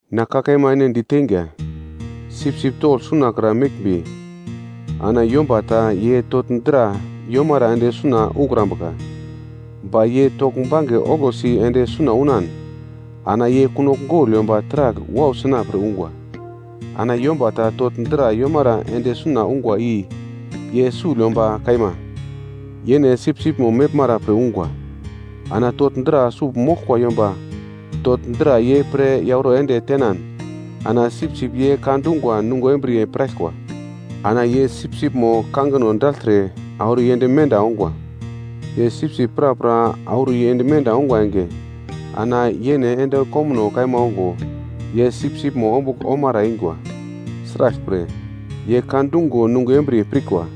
“Na ka kaima ene di teinga, sipsip togl sunakra meglmbi, ana yomba ta ye togl dra yomara ende suna ukrambuka, ba ye togl bange oglosi ende suna unan, ana ye kunogl gogl yomba taragl wau sina pre ungwa. Ana yomba ta togl dra yomara ende suna ungwa i ye sugl yomba kaima, yene sipsipmo meglmara pre ungwa. Ana togl dra sugl moglkwa yomba togl dra ye pre yauro ende tenan ana sipsip ye ka dungwa nungo embriye pirkwa. Ana ye sipsipmo kangino dagltre, auro yend menda ongwa. Ye sipsip prapra auro yend menda ongwa enge, ana yene ende komuno kaima ongo, ye sipsipmo ombugl omara eingwa. Sraglpre, ye ka dungo nungo embriye pirkwa.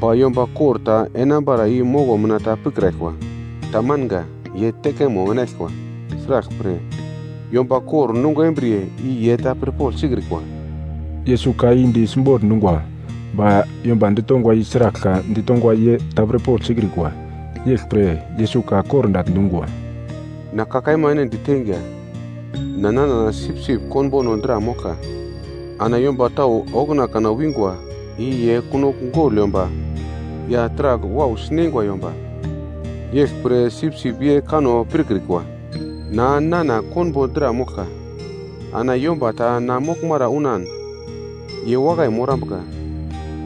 Ba yomba kor ta enambara i moko mina ta pikraglkwa. Tamanga, ye tekemo enaglkwa. Sraglpre, yomba kor nungo embriye i ye ta pirpogl sikrikwa.” Yesus ka i di simbogl dungwa, ba yomba ditongwa i sragl ka di tongwa ye ta pirpogl sikrikwa. Yeglpre Yesus ka kordagl dungwa, “Na ka kaima ene diteinga, na nana sipsip konbono dra moglka. Ana yomba tau okuna kana wingwa i ye kunogl gogl yomba ya taragl wau sineingwa yomba, yeglpre sipsip ye kanno pirkrikwa. Na, nana konbo dra moglka. Ana yomba ta na moglmara unan ye wakai morambuka.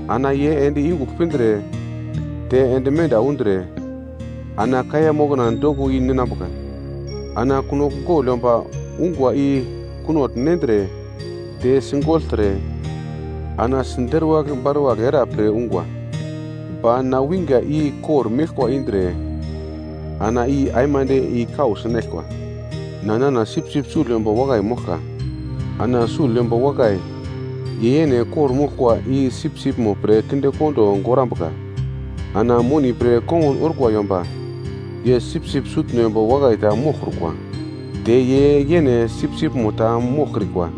Ana ye ende yungugl pindre te ende menda undre, ana kaiya mokna doko i-ninambuka. Ana kunogl gogl yomba ungwa i kunogl nendre, te sigogltre, ana siderwagl baruwagl era pre ungwa. Ba na winga i kor-meglkwa indre, ana i aimande i-kau sinaglkwa. “Na, nana sipsip sugl yomba wakai moglka. Ana sugl yomba wakai, ye yene kor-moglkwa i sipsipmo pre kinde kondo gorambuka. Ana moni pre kongun orkwa yomba, ye sipsip sutno yomba wakai ta moglkrukwa, te ye yene sipsipmo ta moglkrikwa.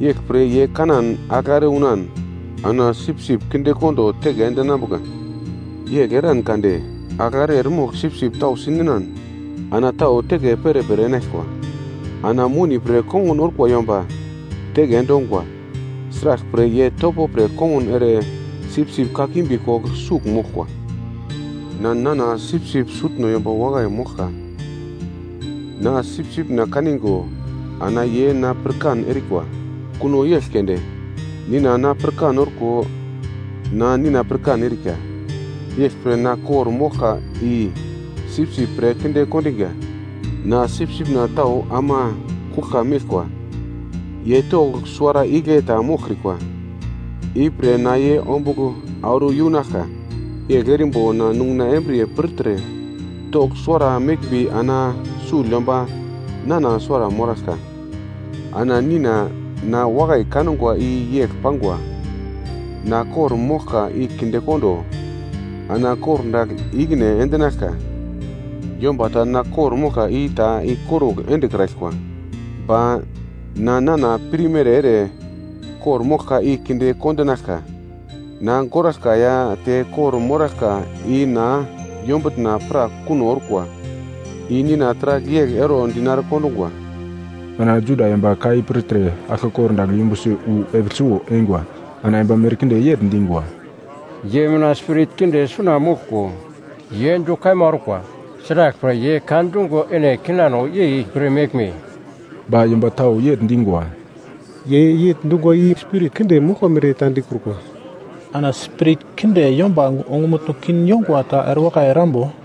Yeglpre ye kanan agl are unan ana sipsip kindekondo teke endinambuka. Yegl eran kade agl are eremogl sipsip tau si ninan ana tau teke perepere enaglkwa. Ana moni pre kongun orkwa yomba teke endongwa. Sraglpre ye topo pre kongun ere sipsip kakimbi kogl sugl moglkwa. “Na, nana sipsip sutno yomba wakai moglka, na sipsipna kaningo, ana ye na pirkan erikwa. Kuno yegl keunde, Nina na pirkan orko, na Nina pirkan erika. Yeglpre na kor-moglka i sipsip pre kinde kondinga. Na sipsipna tau ama kuglka meglkwa, ye togl suwara igle ta moglkrikwa. Ipre na ye ombugl auro yunaglka, yegl erimbo na nunguna embriye pirtre togl suwara meglmbi ana sugl yomba nana suwara moraglka. Ana Nina, na wakai kangwa i yegl pangwa. Na kor-moglka i kindekondo ana kordagl i-ikine endinaglka. Yomba ta na kor-moglka i ta ikorugl endekraglkwa, ba na nana pirmere ere kor-moglka i kinde kondinaglka. Na goraglka ya te kor-moraglka i na yombutna pra kuno orkwa. I Nina taragl yegl ero dinare kondungwa. Ana Juda yomba ka i pirtre aglke kordagl yumbusi wu epigl suwo eingwa. Ana yomba merkinde yegl dingwa, “Ye mina spirit kinde suna moglko, ye du kaima orkwa. Sraglpre ye ka dungo ene kinano yei pir meglme?” Ba yomba tau yegl dingwa, “Ye yegl dungwa i spirit kinde moglkwa mere ta dikrukwa. Ana spirit kinde yomba ongumutno kin yongwa ta erewakai erambo?”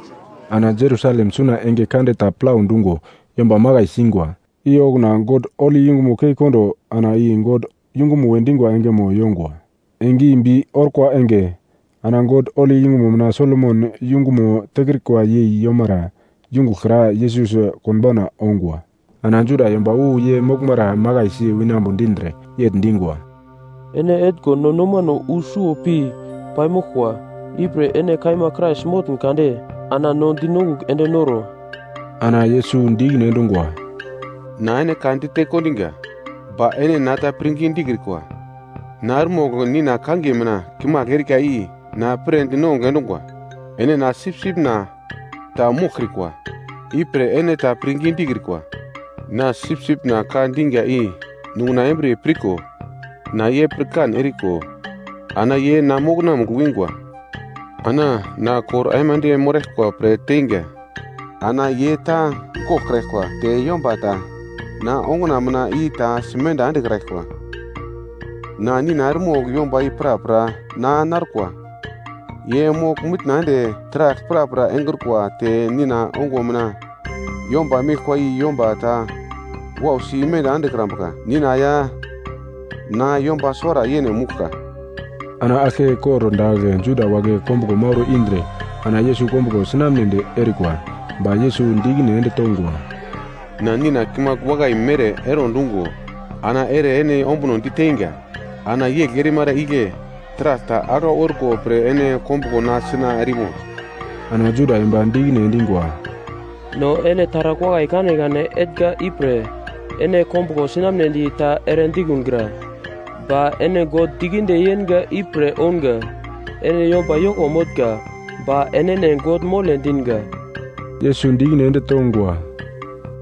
Ana Jerusalem suna enge kande ta plau dungo yomba makai singwa. I okuna God holi yungumo kei kondo ana i God yungumo we dingwa engemo yongwa. Enge i bi orkwa enge. Ana God holi yungumo mina Solomon yungumo tekrika yei yomara yungugl kra Yesus konbauna ongwa. Ana Juda yomba wu ye moglmara makaisi winambo dindre, yegl dingwa, “Ene etngo no nomano wu suwo pi paimoglkwa. Ipre ene kaima Krais motn kade ana no dinongugl ende noro.” Ana Yesus di ikine endungwa, “Na ene kade dite kondinga, ba ene na ta pirngi dikrikwa. Na eremogl Nina kangiye mina kimagl erika i na pre dinongugl endungwa. Ene na sipsipna ta moglkiurikwa, ipre ene na ta pirngi dikrikwa. Na sipsipna ka dinga i nunguna embriye pirko, na ye pirkan eriko, ana ye na mokonamugl wingwa. Ana na kor aimande moraglkwa pre teinga, ana ye ta goglkraglkwa te yomba ta na onguna mina i ta simenda endekraglkwa. Na Nina eremogl yomba i prapra na narkwa. Ye mogl-mitna ende taragl prapra engrukwa te Nina ongo mina yomba meglkwa i yomba ta wausi imenda endekrambuka. Nina ya na yomba suwara yene mouglka.” Ana aglke kordagl Juda wagle kombuglo mauro indre ana Yesus kombuglo sinamnedi erikwa. Ba Yesus di ikine ende tongwa, “Na Nina kimagl wakai mere ero dungo ana ere ene ombuno diteinga. Ana yegl erimara igle taragl ta aglau orko pre ene kombuglo na sina erimo?” Ana Juda yomba di ikine endingwa, “No ene taragl wakai kanekane etnga ipre ene kombuglo sinamnedi ta ere dikungra, ba ene God dikinde yenga ipre ounga. Ene yomba yoko motnga, ba enene God mole dinga.” Yesus di ikine ende tongwa,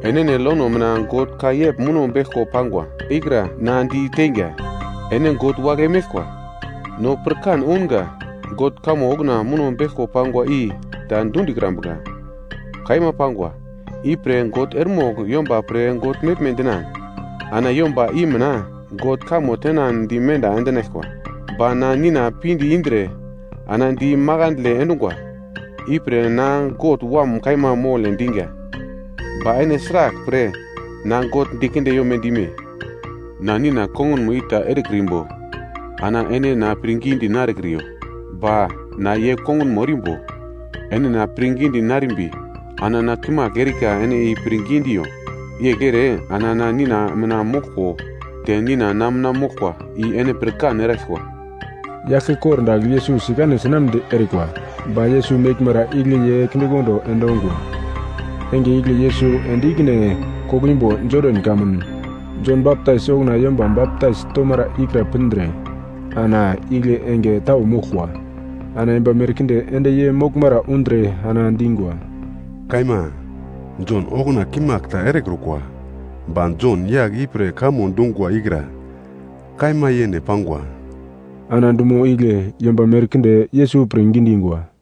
“Enene lono mina God ka yegl muno beglko pangwa ikra na di teinga, ‘Ene god wagle meglkwa.’ No pirkan ounga, God kamo okuna muno beglko pangwa i ta dundikrambuka, kaima pangwa. Ipre God eremogl yomba pre god meglme dinan ana yomba i mina God kamo tenan di menda endinaglkwa. Ba na Nina pinde indre na di makandle endungwa. Ipre na God Wam kaima mole diga, ba ene sraglpre na God dikinde yome dime? Na Nina kongunmo i ta erekrimbo, ana ene na pirngidi narekriyo. Ba na ye kongunmo erimbo, ene na pirngidi narekrimbi ana na kimagl erika ene i pirngi diiyo. Yegl ere ana na Nina mina moglko te Nina na mina moglkwa i ene pirkan eraglkwa.” Ye aglke kordagl Yesus sikane sinamnedi erikwa. Ba Yesus meglmara igle ye kindekondo endongwa. Enge igle Yesus ende ikine koglo imbo Jodan kamun Jon Baptais okuna yomba baptais tomara ikra pindre ana igle enge tau moglkwa. Ana yomba merkinde ende ye moglmara undre ana dingwa, “Kaima, Jon okuna kimagl ta erekrukwa, ba Jon yagl i pre kamo dungwa ikra kaima yene pangwa.” Ana dumo igle yomba merkinde Yesus pirngi dingwa.